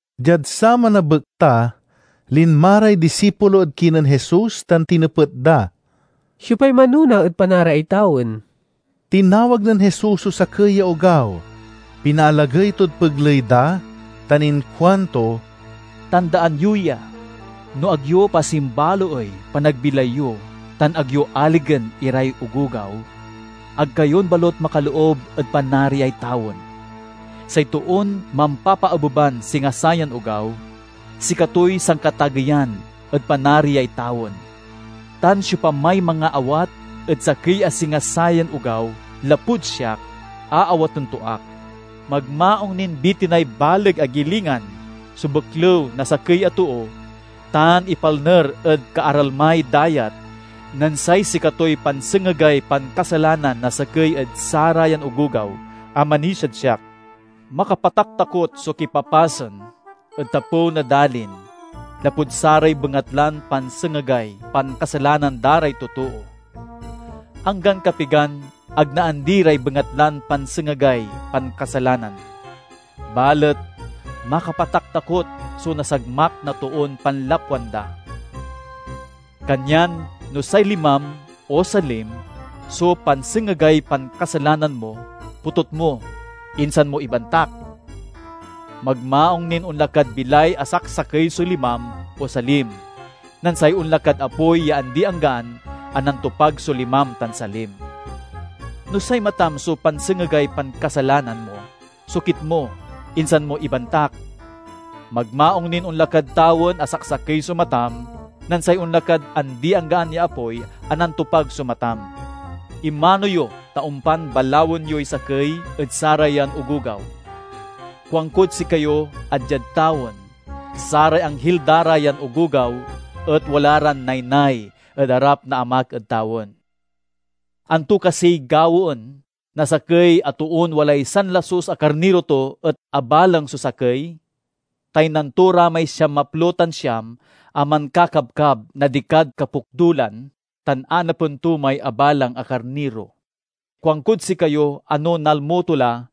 Diad saman a bekta, linma ray disipulo ed kinen Jesus tan tinepet da, "Siopay manona ed Panariay tawen?" Tinawag nen Jesus so sakey ya ogaw, pinaalagey tod pegley da, tan inkuanto, "Tandaan yo ya! No ag yo pasimbaloey panagbilay yo tan ag yo aligen iray ogogaw, ag kayon balut makaloob ed Panariay tawen. Say toon mampapaabeban singa sayan ogaw, sikatoy sankatageyan ed Panariay tawen. Tan siopamay mangaawat ed sakey a singa sayan ogaw lapud siak, aawaten to ak." "Magmaung nin bitinay baleg a gilingan so beklew na sakey a too tan ipalner ed kaaralmay dayat nen say sikatoy pansengegay pankasalanan na sakey ed sarayan ogogaw a manisiad siak. Makapataktakot so kipapasen ed tapew na dalin, lapud saray bengatlan pansengegay pankasalanan da ray totoo! Anggan kapigan ag naandi ray bengatlan pansengegay pankasalanan, balet makapataktakot so nasagmak na toon panlapwan da! "Kanyan no say limam o salim so pansengegay pankasalanan mo potut mo, insan mo ibantak! Magmaung nin onla kad bilay a saksakey so limam o salim, nen say onla kad apoy ya andianggaan a nantopag so limam tan salim. No say matam so pansengegay pankasalanan mo sokit mo, insan mo ibantak! Magmaung nin onla kad tawen a saksakey so matam, nen say onla kad andianggaan ya apoy a nantopag so matam." "Imano yo ta ompan balawen yoy sakey ed sarayan ogogaw. Kuankod sikayo a diad tawen, saray anghil da ra yan ogogaw et wala ran naynay ed arap na Amak ed tawen. "Anto kasiy gawaen na sakey a toon walay sanlasus a karniro to et abalang so sakey? Taynan to ra may siamaplo tan siam a mankakabkab na dikad kapokdulan tan anapen to may abalang a karniro. Kuankod sikayo a no nalmo, to la,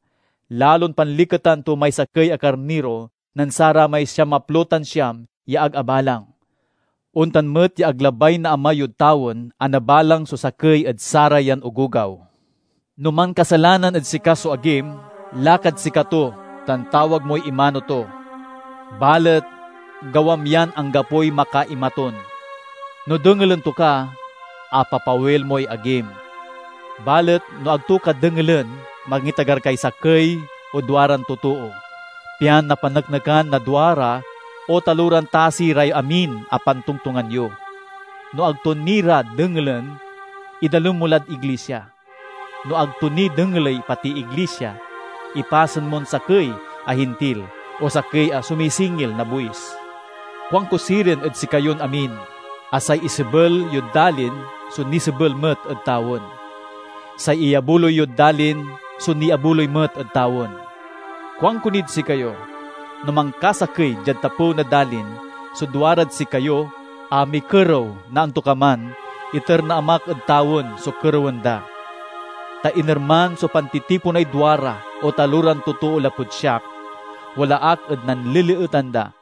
lalon panliketan to may sakey a karniro nen saramay siamaplo tan siam ya ag abalang. Ontan met ya ag labay na Ama yod tawen a nabalang so sakey ed sarayan ogogaw." "No mankasalanan ed sika so agim, lakad sikato tan tawag moy imano to. Balet gawam yan anggapoy makaimatun. No dengelen to ka, apapawil moy agim. Balet no ag to ka dengelen mangitagar kay sakey o duaran totoo, pian napaneknekan na duara o taloran tasi ray amin a pantongtongan yo. No ag to ni ra dengelen, idalem mo lad iglisia. No ag to ni dengeley pati iglisia, ipasen mon sakey a Hintil o sakey a sumisingil na buis." "Kuanko sirin ed sikayon amin a say isebel yod dalin so nisebel met ed tawen; say iyabuloy yod dalin so niabuloy met ed tawen. "Kuanko nid sikayo: no mankasakey diad tapew na dalin so duarad sikayo a mikerew na antokaman, iter na Amak ed tawen so kerewen da. Ta inerman so pantitiponay duara o taloran totoo lapud siak, wala ak ed nanleleetan da."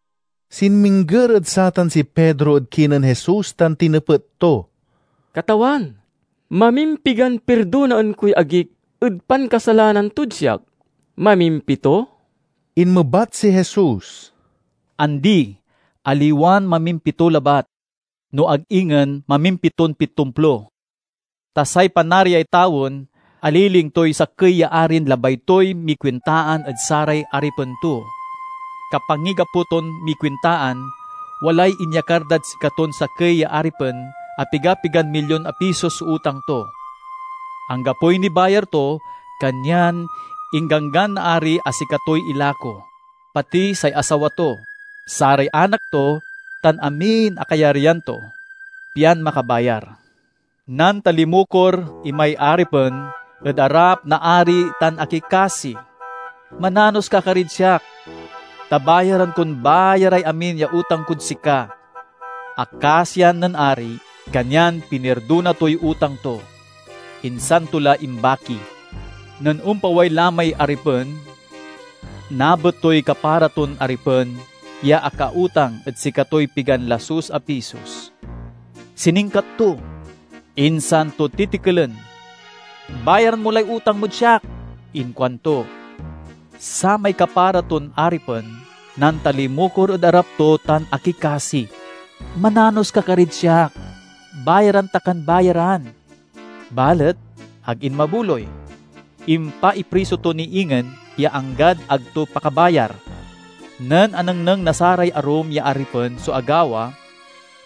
Sinmingger ed satan si Pedro ed kinen Jesus tan tinepet to, "Katawan, mamimpigan pirdonaen koy agik ed pankasalanan tod siak? Mamimpito?" Inmebat si Jesus, "Andi! Aliwan mamimpito labat, no ag ingen mamimpiton pitomplo. Ta say Panariay tawen aliling toy sakey ya arin labay toy mikuintaan ed saray aripen to. Kapanggigapo ton mikuintaan, walay inyakar dad sikaton sakey ya aripen a piga-pigan milyon a pisos so utang to. Anggapoy nibayar to, kanyan ingganggan na ari a sikatoy ilako, pati say asawa to, saray anak to, tan amin a kayaryan to, pian makabayar. Nantalimukor imay aripen ed arap na ari tan akikasi, 'Mananos ka karid siak, ta bayaran kon bayaray amin ya utang kod sika!' Akasian nen ari kanyan pinirdona toy utang to, insan to la imbaki. "Nen ompaway la may aripen, nabet toy kapara ton aripen ya akautang ed sikatoy pigan lasus a pisos. Siningkat to, insan to titikelen. 'Bayaran mo lay utang mod siak!' inkuanto. Samay kapara ton aripen nantalimukor ed arap to tan akikasi, 'Mananos ka karid siak; bayaran ta kan bayaran!' Balet ag inmabuloy. Impaipriso to ni ingen ya anggad ag to pakabayar. Nen anengneng na saray arum ya aripen so agawa,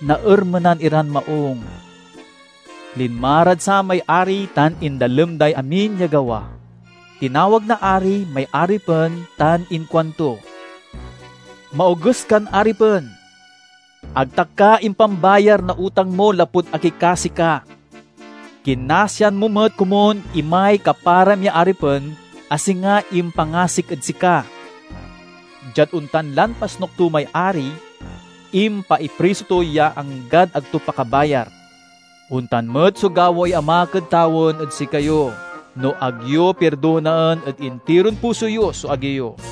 naermenan iran maung. Linma rad samay ari tan indalem day amin ya gawa. Tinawag na ari may aripen tan inkuanto, 'Maoges kan aripen! Ag ta ka impambayar na utang mo lapud akikasi ka. Kinasian mo met komun imay kaparam ya aripen a singa impangasik ed sika!' Diad ontan lan pasnuk to may ari, impaipriso to ya anggad ag to pakabayar. "Ontan met so gawaey Amak ed tawen ed sikayo, no ag yo pirdonaen ed intiron puso yo so agi yo."